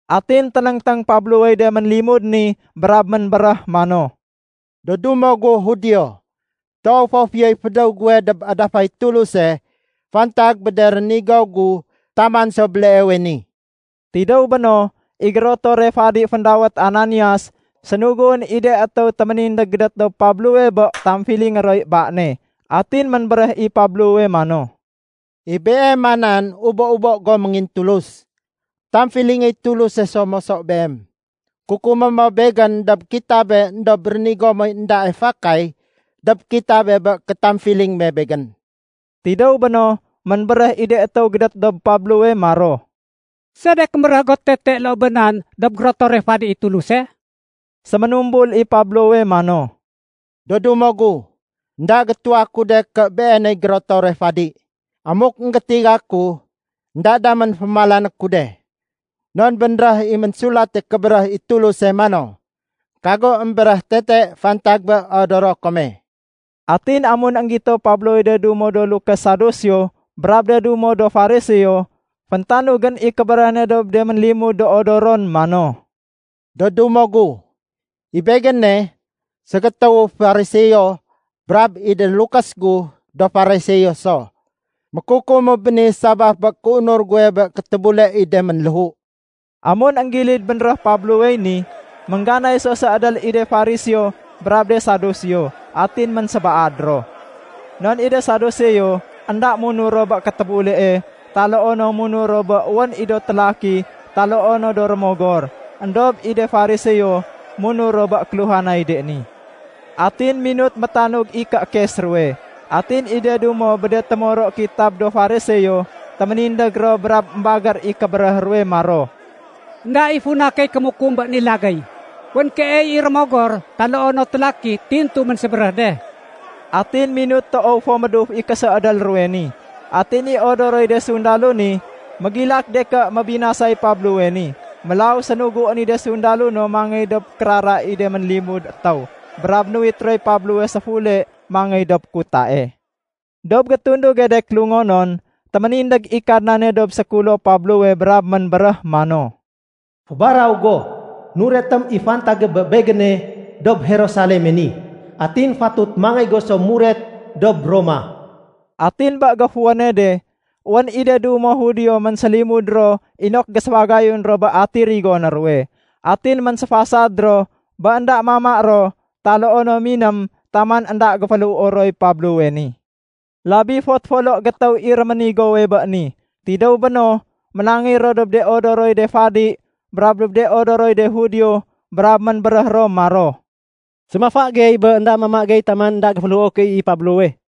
Atin ténéngténg Pablowey de ménlimud ni brab ménbéréh mano, “Do dumo gu Judio, toow fo fiyoy fédéw guwe dob adafay Tuluse fantag bé de rénigo gu taman so béleewe ni.” Tidéw béno, i gérotore fadi féndawét Ananias, sénuguén i de étéw téménindég gédét dob Pablowe bé tamfilingé roy ba ne. Atin ménbéréh i Pablowe mano, “I beema nan ubo-ubo go méngintulus! Tamfilingéy Tuluse so moso beem. Kukumé mo begén dob kitabe éndob rénigo moy éndae fakay dob kitabe bé kéfétamfiling me begén.” Tidéw béno, ménbéréh i de étéw gédét dob Pablowe maro, “Sedek émbéréh go tete loo bé nan dob gérotore fadi i Tuluse?” Séménumbul i Pablowe mano, “Do dumo gu, énda gétuwa ku de ké beeney gérotore fadi. Amuk énggétiga ku, énda damén fémalané ku de. Non bénréh i Ménsulate Kébéréh i Tuluse mano, ‘Kago émbéréh tete fantag bé odoro kome.’” Atin amun énggito Pablowey de dumo do lukés Saduseo brab de dumo do Fariseo, féntanugén i kébéréh ne dob de ménlimud do odoron mano, “Do dumo gu, i begéne, ségétéwu Fariseo brab i de lukés gu do Fariseo so. Mékukumu béni sabaf bé kéunur guwe bé kétébule i de ménléhu.” Amun énggilid bénréh Pablowey ni, méngganay so séédél i de Fariseo brab de Saduseo, atin ménsébaad ro. (Non i de Saduseo énda munur ro bé kétébulee, taloo no munur ro bé wén i do télaki taloo no do rémogor. Endob i de Fariseo munur ro bé kéluhanay de ni.) Atin minut métanug i kéékes ruwe. Atin i de dumo bé de témoro kitab do Fariseo, téménindég ro brab émbagér i kébéréh ruwe maro, “Enda i funa key kémukum bé ni lagéy. Wén keey i rémogor taloo no télaki tintu ménsébéréh de.” Atin minut toow fo méduf i késéédél ruwe ni. Atin i odoroy de sundalo ni, mégilak de ké mébinasay Pablowe ni. Mélaw sénuguén i de sundalo no mangéy dob kérara i de ménlimud étéw brab nuwit roy Pablowe séfule mangéy dob kutae. Dob gétunduge de kélungonon, téménindég i Kadnane dob sékulo Pablowe brab ménbéréh mano, “Fébaraw go. Nuretém i fantage bé Begéne dob Jerusaleme ni. Atin fatut mangéy go so muret dob Roma.” Atin bé géfuwéne de, wén i de dumo Judio ménsélimud ro inok géséfagayun ro bé ati rigoné ruwe. Atin ménséfasad ro bé énda mama ro taloo no miném taman énda géféléhuo roy Pablowe ni. Labi fot folo gétéw i réménigowe bé ni. Tidéw béno, ménangéy ro dob de odoroy de fadi brab dob de odoroy de Judio brab ménbéréh ro maro, “Séménafa gey bé énda mama gey taman énda géféléhuo key i Pablowe.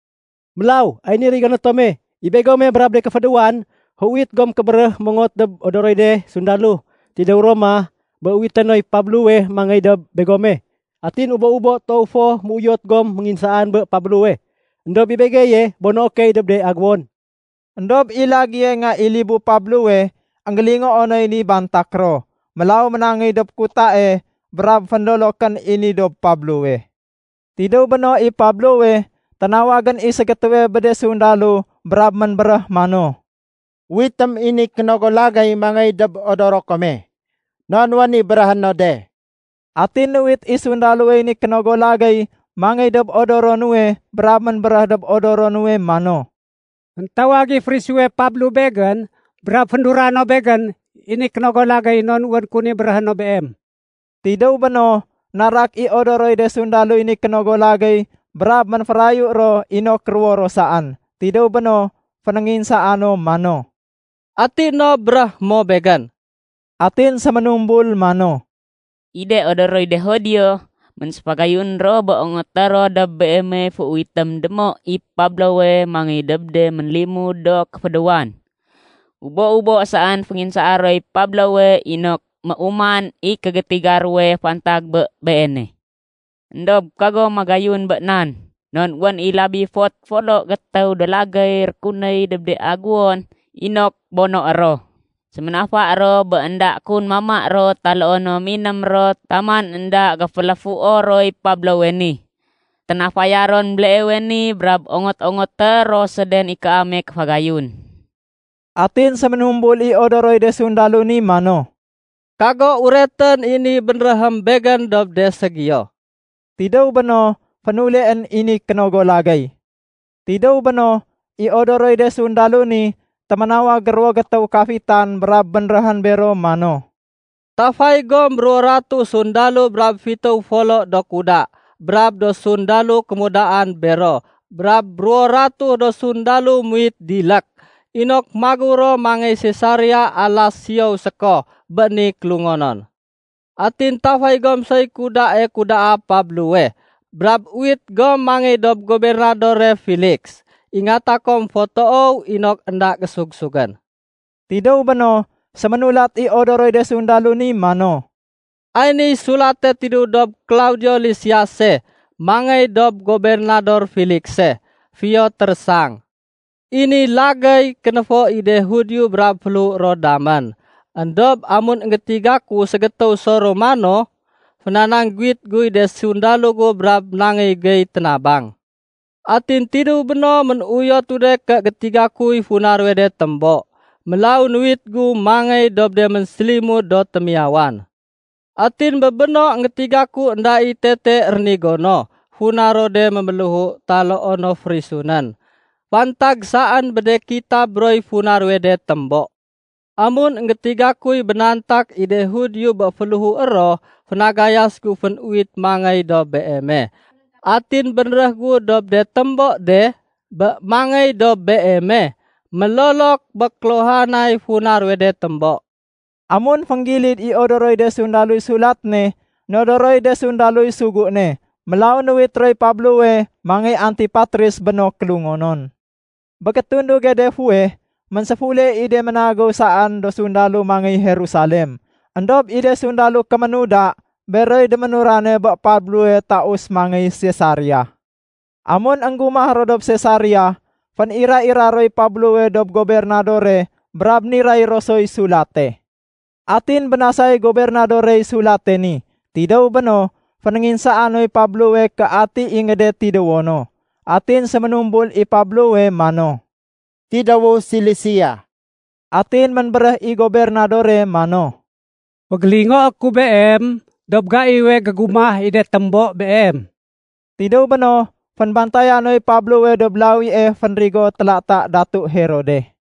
Mélaw ay niy rigoné tome. I begome brab de kéfédéwan, féuwit gom kébéréh mongot dob odoroy de sundalo tidéw Roma bé uwité noy Pablowe mangéy dob begome. Atin ubo-ubo toow fo méuyot gom ménginsaan bé Pablowe. Endob i begeye bonoé key dob de agéwon.” Endob i lagéye nga i libu Pablowe énggélingoo noy ni bantak ro. Mélaw ménangéy dob kutae brab fénlolokén i ni dob Pablowe. Tidéw béno i Pablowe, ténawagén i ségétéwe bé de sundalo brab ménbéréh mano, “Uwitém i ni kénogo lagéy mangey dob odoro kome. Non wén i béréhé no de.” Atin nuwit i sundalowey ni kénogo lagéy mangey dob odoro nuwe brab ménbéréh dob odoro nuwe mano, “Féntawag i férisuwe Pablo begén brab féndura no begén i ni kénogo lagéy non wén kun i béréhé no beem.” Tidéw béno, narak i odoroy de sundaloy ni kénogo lagéy brab ménférayu ro inok ruwo ro saén. Tidéw béno, fénénginsaa no mano, “Ati no béréhé mo begén?” Atin séménumbul mano, “I de odoroy de Judio ménséfagayun ro bé ongoté ro dob beemey féuwitém démo i Pablowe mangéy dob de ménlimud do kéfédéwan. Ubo-ubo saén fénginsaa roy Pablowe inok méuman i gétiga ruwe fantag bé beene. Endob kago magayun bé nan. Non wén i labi fot folo gétéw do lagéy rékunéy dob de agéwon inok bonoé ro. Séménafa ro bé énda kun mama ro taloo no miném ro taman énda géféléhuo roy Pablowe ni. Ténafaya ron béleewe ni brab ongot-ongoté ro séden i kaame kéfagayun.” Atin séménumbul i odoroy de sundalo ni mano, “Kago uretén i ni bénréhém begén dob de ségiyo.” Tidéw béno, fénuleén i ni kénogo lagéy. Tidéw béno, i odoroy de sundalo ni, téménawag ruwo gétéw kafitan brab bénréhén bero mano, “Tafay gom ruwo ratuh sundalo, brab fitéw folo do kuda brab do sundalo kémudaan bero, brab ruwo ratuh do sundalo muwit dilék inok magéw ro mangéy Sesaria alas siyow séko bé ni kélungonon. Atin tafay gom soy kudae kudaa Pablowe brab uwit gom mangéy dob Gobernadore Feliks. Ingata kom fo toow inok énda gésug-sugén.” Tidéw béno, séménulat i odoroy de sundalo ni mano, “Ay niy sulate tidéw dob Klaudio Lisiase mangéy dob Gobernador Felikse. Fiyo térésang. I ni lagéy kénéfo i de Judio brab féléhué ron damén. Endob amun énggétiga ku ségétéw so Romano, fénanangguwit guy de sundalo gu brab nangéy gey ténabang. Atin tidéw béno, ménuyotu de ké gétiga kuy funa ruwe de témbo. Mélaw nuwit gu mangéy dob de ménsélimud do témiyawan. Atin bé béno, énggétiga ku énda i tete rénigo no, funa ro de méméléhu taloo no férisunén. Fantag saén bé de kitab roy funa ruwe de témbo. Amun énggétiga kuy bénantak i de Judio bé féléhué ro, fénagayas gu fénuwit mangéy dob beeme. Atin bénréh gu dob de témbo de bé mangéy dob beeme mélolok bé kéluhanay funa ruwe de témbo.” Amun fénggilid i odoroy de sundaloy sulat ne, nodoroy de sundaloy sugu ne. Mélaw nuwit roy Pablowe mangéy Antipatris bé no kélungonon. Bé gétunduge de fuweh ménséfule i de ménagéw saén do sundalo mangéy Jerusalem. Endob i de sundalo do kémuda, beroy déménurane bé Pablowe taus mangéy Sesaria. Amun énggumah ro dob Sesaria, fénira-ira roy Pablowe dob gobernadore brab niray ro soy sulate. Atin bénasay gobernadorey sulate ni. Tidéw béno, fénénginsaa noy Pablowe ké ati ingéde tidéwo no. Atin séménumbul i Pablowe mano, “Tidéwu Silisia.” Atin ménbéréh i gobernadore mano, “Fégélingoé ku beem dob gaiwe gégumah i de témbo beem.” Tidéw béno, fénbantaya noy Pablowe dob lawie fénrigo télata Datu Herode.